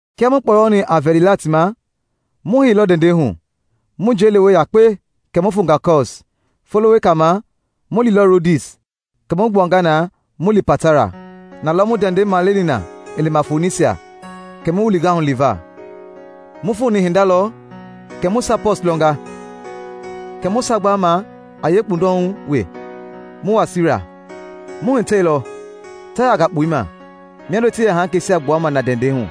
Kia mu kpɔyɔni a vɛlila ti ma mu heilɔ ndɛndɛ hu mu njei lewe yakpe kɛ mu fonga Kɔs; folo wekei ma mu liilɔ Rodis, kɛ mu gbuanga na mu lii Patara. Nalɔ mu ndɛndɛi maleni na i lima Fonisia, kɛ mu wilinga hu liva. Mu foni hinda lɔ kɛ mu Saipɔs lɔnga, kɛ mu sagbaama a yee kpundɔhu wee mu wa Siira. Mu hitɛilɔ Taaya gakpɔima miando ti yɛ haŋkeisia gbuama na ndɛndɛi hu.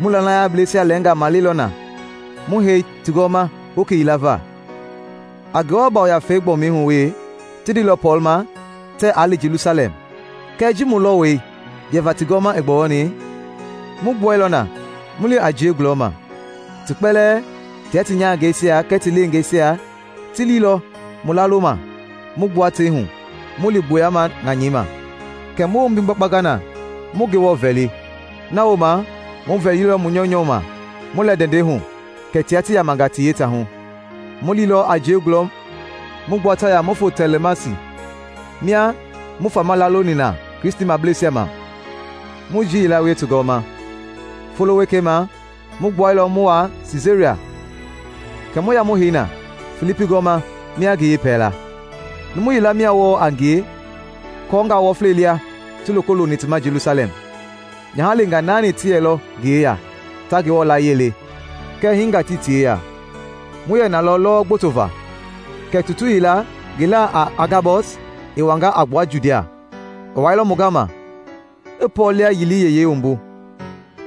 Mu lanayableisia lɛnga male nalɔ mu hei ti gɔɔma hoki yila va. A Ngewɔ Yafei gbɔmi hu wee ti ndeilɔ Pɔɔl ma tɛ aa li Jelusalɛm. Kɛɛ ji mu lɔwɔi yɛva ti gɔɔma i gbɔyɔni, mu gbuailɔ na mu lii a jiei gulɔma. Ti kpɛlɛɛ, tia ti nyahangɛisia kɛɛ ti lengeisia, ti liilɔ mu laaloma mu gbua tei hu mu li gboya ŋanyɛi ma, kɛ mu wombi gbakpanga na mu Ngewɔ vɛli. Na wooma mu vɛlilɔ mu nyɔunyɔ ma mu lɛ ndɛndɛi hu, kɛ tia ti yamanga ti yetaahu. Mu liilɔ a jiei gulɔ mu gbua Taaya mu fo Tolɛmaisi, mia mu fama laaloni na Kristimableisia ma mu jii yila wie ti gɔɔma. Folo wekei ma mu gbuailɔ mu wa Siisaria kɛ mu ya mu hei na Filipi gɔɔma mia ngi yɛpɛlaa. Numu yila mia wɔɔ a ngie kɔɔnga wɔfla lia ti loko looni ti ma Jelusalɛm. Nyaha leengaa naani ti yɛlɔ ngi yeya ta Ngewɔ layie le, kɛɛ hinga tii ti yeya. Mu yɛ nalɔ lɔwɔ gboto va kɛ tutu yila ngi laa a Agabɔs i wanga a gbua Judia. I wailɔ mu gama, i Pɔɔl liayili yeyei wumbu,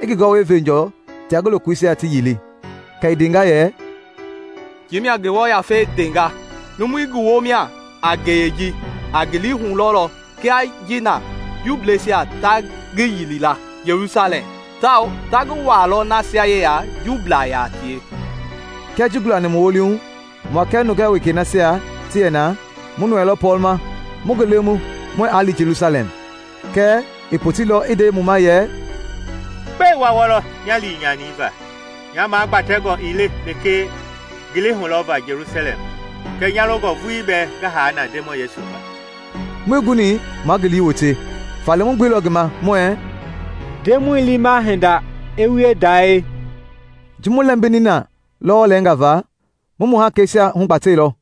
i ngi gɔwɛi venjɔ tia ngi lokoisia ti yili, kɛ i ndenga yɛ, “Ji mia Ngewɔ Yafei ndenga: Numui ngi womia a ngeyei ji a ngili hulɔlɔ kia ji na Juubleisia ta ngi yilila Jelusalɛm, tawao ta ngi wuaalɔ nasia yeya Juublaa yaa tie.” Kia ji gulani mu wolihu, mua kɛɛ nungaa wekei nasia ti yɛ na mu nɔɔɛilɔ Pɔɔl ma mu ngi lemu muɛɛ aa lii Jelusalɛm. Kɛɛ i poteilɔ i nde mu ma yɛ, “Gbɛe wa wɔlɔ nya lii nyani va? Nya magbɛntɛngɔ ii le lekee ngili hulɔva Jelusalɛm kɛɛ nya longɔ vuii bɛɛ ngi haa na Ndemɔi Yesu va.” Muii guni ma ngi lii wote, faale mu gbeilɔ ngi ma muɛɛ, “Ndemɔi liima hinde i wie dae.” Ji mu lɛmbini na lɔwɔ lɛnga va, mu mu hakeisia hugbatɛilɔ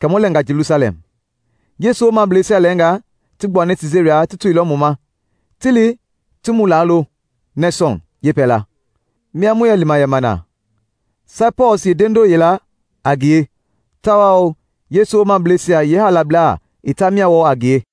kɛ mu lɛnga Jelusalɛm. Yesu woomableisia lɛnga ti gbuani Siisaria ti toilɔ mu ma ti li ti mu laalo Nesɔn yepɛlaa, mia mu yɛ lima yɛma na. Saipɔs yeendendoo yɛla a ngie tawaa Yesu womableisia yeehaalablaa itaa mia wɔɔ a ngie.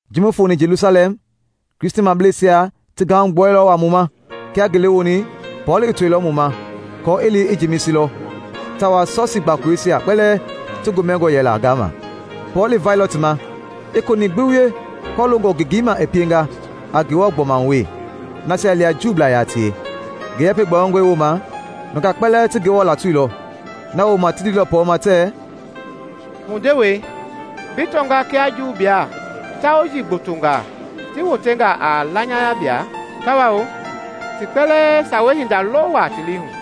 Ji mu foni Jelusalɛm, Kristimableisia ti gahugbuailɔ waa mu ma. Kia ngele woni, Pɔɔl i toilɔ mu ma kɔɔ i li i Jemisi lɔ; tawao Sɔsii gbakoloisia kpɛlɛɛ ti gomɛngɔ yɛla gaama. Pɔɔl i vailɔ ti ma i konɛi gbi wie kɔloongɔ ngengei ma i pienga a Ngewɔ gbɔma hu wee nasia lia Juublaa yaa tie. Ngi yɛpɛ gbɔyɔngɔi woma, nungaa kpɛlɛɛ ti Ngewɔ latoilɔ. Na wooma ti ndeilɔ Pɔɔl ma tɛɛ, “Mu ndewei, bi tɔnga kia Juublaa yeetauji gbotongaa ti wotenga a lanayablaa, tawao ti kpɛlɛɛ sawei hinda lɔ wa ti lii hu.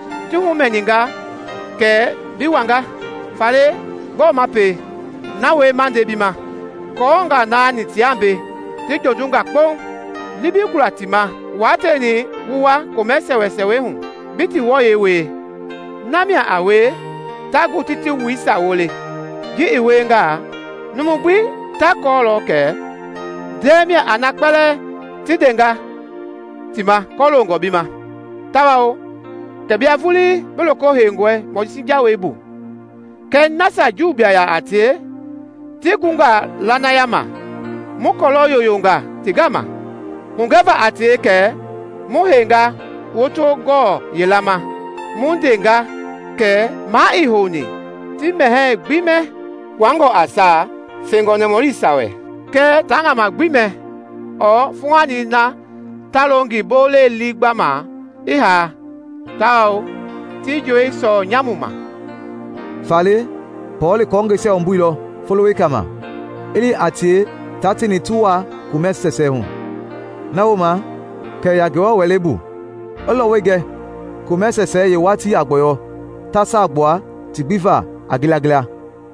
Ti humɛninga kɛ bi wanga. Faale gbɔɔ ma pie? Na wie ma nde bi ma. Kɔɔnga naani tia mbei ti jondunga kpo. Li bi gula ti ma wa tieni wu wuaa komɛ sɛsɛɛ hu bi ti wɔyɛi wie; na mia a wie ta gu ti ti wuisia wole. Ji i wiengaa numu gbi ta kɔɔlɔ kɛ ndɛɛ mia a na kpɛlɛɛ ti ndenga ti ma kɔloongɔ bi ma, tawao kɛ bia vuuli bi loko heingɔi Mojisi jawei bu. Kɛɛ nasia Juublaa yaa tie ti gunga lanaya ma, mu kɔlɔ yoyonga ti gama hugɛva a tie kɛ mu heinga woto gɔɔ yila ma mu ndenga kɛ maa ii houni ti mɛhɛɛ gbii mɛ kpuangɔ a saa fengɔ nɔmɔlisia wɛ, kɛɛ ta ŋama gbi mɛ ɔɔ fuuhani na ta lo ngi bolei liigbama i haa tawao jowii sɔɔ nyamu ma.” Faale Pɔɔl i kɔɔngɛisia wumbuilɔ folo wekei ma i li a tie taa tieni ti wuaa komɛ sɛsɛɛ hu. Na wooma kɛ i ya Ngewɔ wɛleibu i lɔwɔi gɛ komɛ sɛsɛɛ yeewatii a gbɔyɔ ta saa gbua ti gbi va a ngilangila.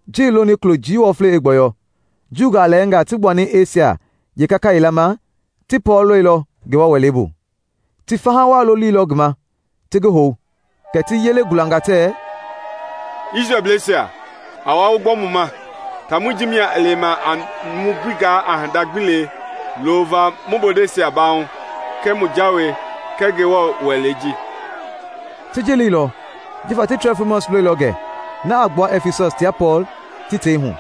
Ji i loni kulo jii wɔflei i gbɔyɔ, Juungaa lɛnga ti gbuani Esia yeekaka yila ma, ti Pɔɔl lɔilɔ Ngewɔ wɛleibu. Ti faha waa lolilɔ ngi ma ti ngi hou, kɛ ti yele gulanga tɛɛ, “Isrɛlbleisa, a wa wu gbɔ mu ma! Taamɔi ji mia a lewe a numu gbi gaa hinda gbi lee loova mu bondeisia baahu, kɛɛ mu jawei, kɛɛ Ngewɔ wɛlei ji!” (Ti ji leilɔ jifa ti Trofimɔs lɔilɔ gɛ na a gbua Ɛfisɔs tia Pɔɔl ti tei hu,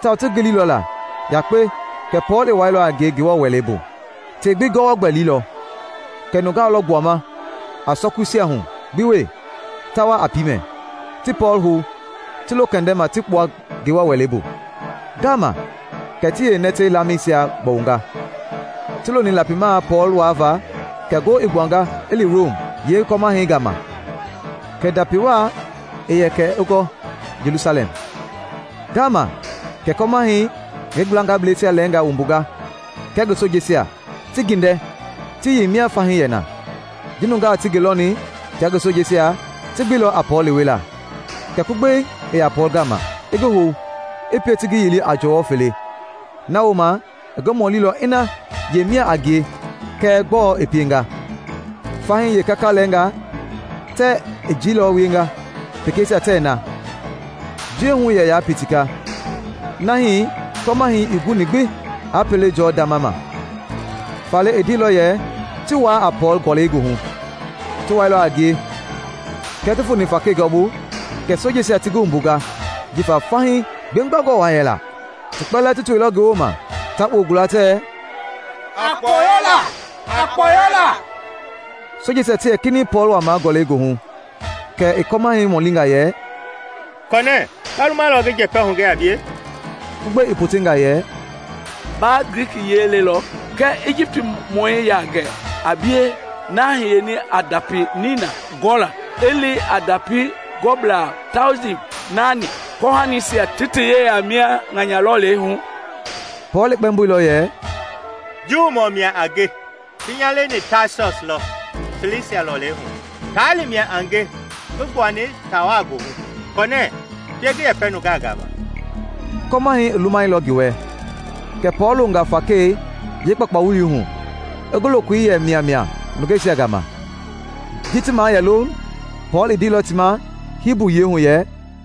tawao ti gililɔ la yakpe kɛ Pɔɔl i wuaalilɔ a ngie Ngewɔ wɛlei bu.) Tei gbi gɔwɔ gbɛlilɔ, kɛ nungaa lɔ gbuama a sɔkuisia hu gbi wee ta wa a piimɛi, ti Pɔɔl hou ti lo kɛndɛma ti kpua Ngewɔ wɛlei bu. Ngaama kɛ ti yeenɛtɛ laamɛisia gbɔwunga. Ti loni lapimaa Pɔɔl waava kɛ ngo i gbuanga i li Rom yee kɔmahɛi gama kɛ ndapi waa yɛ kɛ a gula Jelusalɛm. Ngaama kɛ kɔmahɛi i ngi gblangablɛisia lɛnga wumbunga kɛɛ ngi sojeisia ti gindɛ ti yei mia fahii yɛ na. Ji nungaa ti ngi lɔni tia ngi sojeisia, ti gbeilɔ a Pɔɔl lewela. Kɛ kugbei i ya Pɔɔl gama, i ngi hou, i pie ti ngi yili a jɔwɔ fele. Na wooma i ngi mɔlilɔ ina yemia a ngie kɛɛ gbɔɔ i pienga. Fahii yeekaka lɛnga tɛ i jilɔ wienga, pekeisia tɛ na. Njiɛ hu yɛyaa pitika nahi kɔmahɛi ii guni gbi a pele jɔɔ ndama ma; faale i ndeilɔ yɛ ti wuaa a Pɔɔl gɔlɛi goohu. Ti wuailɔ a ngie, kia ti foni fakei gɔɔbu kɛ sojeisia ti ngi wumbunga jifa fahii gbegbangɔ waa yɛla. Ti kpɛlɛɛ ti toilɔ ngi woma ta kpoo gula tɛ, “A kpɔyɔ la!” Sojeisia ti yɛ kinɛiŋ Pɔɔl wuaama gɔlɛi goohu, kɛ i kɔmahɛi mɔlinga yɛ, “Kɔnɛ ba lumalɔ ngi njɛpɛ hugɛ a bie?” Kɛ kugbei i potenga yɛ, “Ba Glikiyiɛi lelɔ? Kɛɛ Ijipt-mɔi yaa gɛ a bie na hiyeni i ndapi nina gulɔ i li a ndapi gɔblaa tauji naani kɔhanisia ti ti yeya mia ŋanya lɔlei hu?” Pɔɔl i kpɛmboilɔ yɛ, “Juumɔ mia a nge; ti nya leni Taasɔs lɔ Silisia lɔlei hu, taali mia a nge ngi gbuani taawa goohu. Kɔnɛ pie ngi yɛpɛ nungaa gama.” Kɔmahɛi i lumailɔ ngi wɛ, kɛ Pɔɔl loonga fakei yeekpakpawuli hu i ngi lokoi yɛ miamia nungeisia gama. Ji ti mayɛloŋ, Pɔɔl i ndeilɔ ti ma Hibu yiɛi hu yɛ: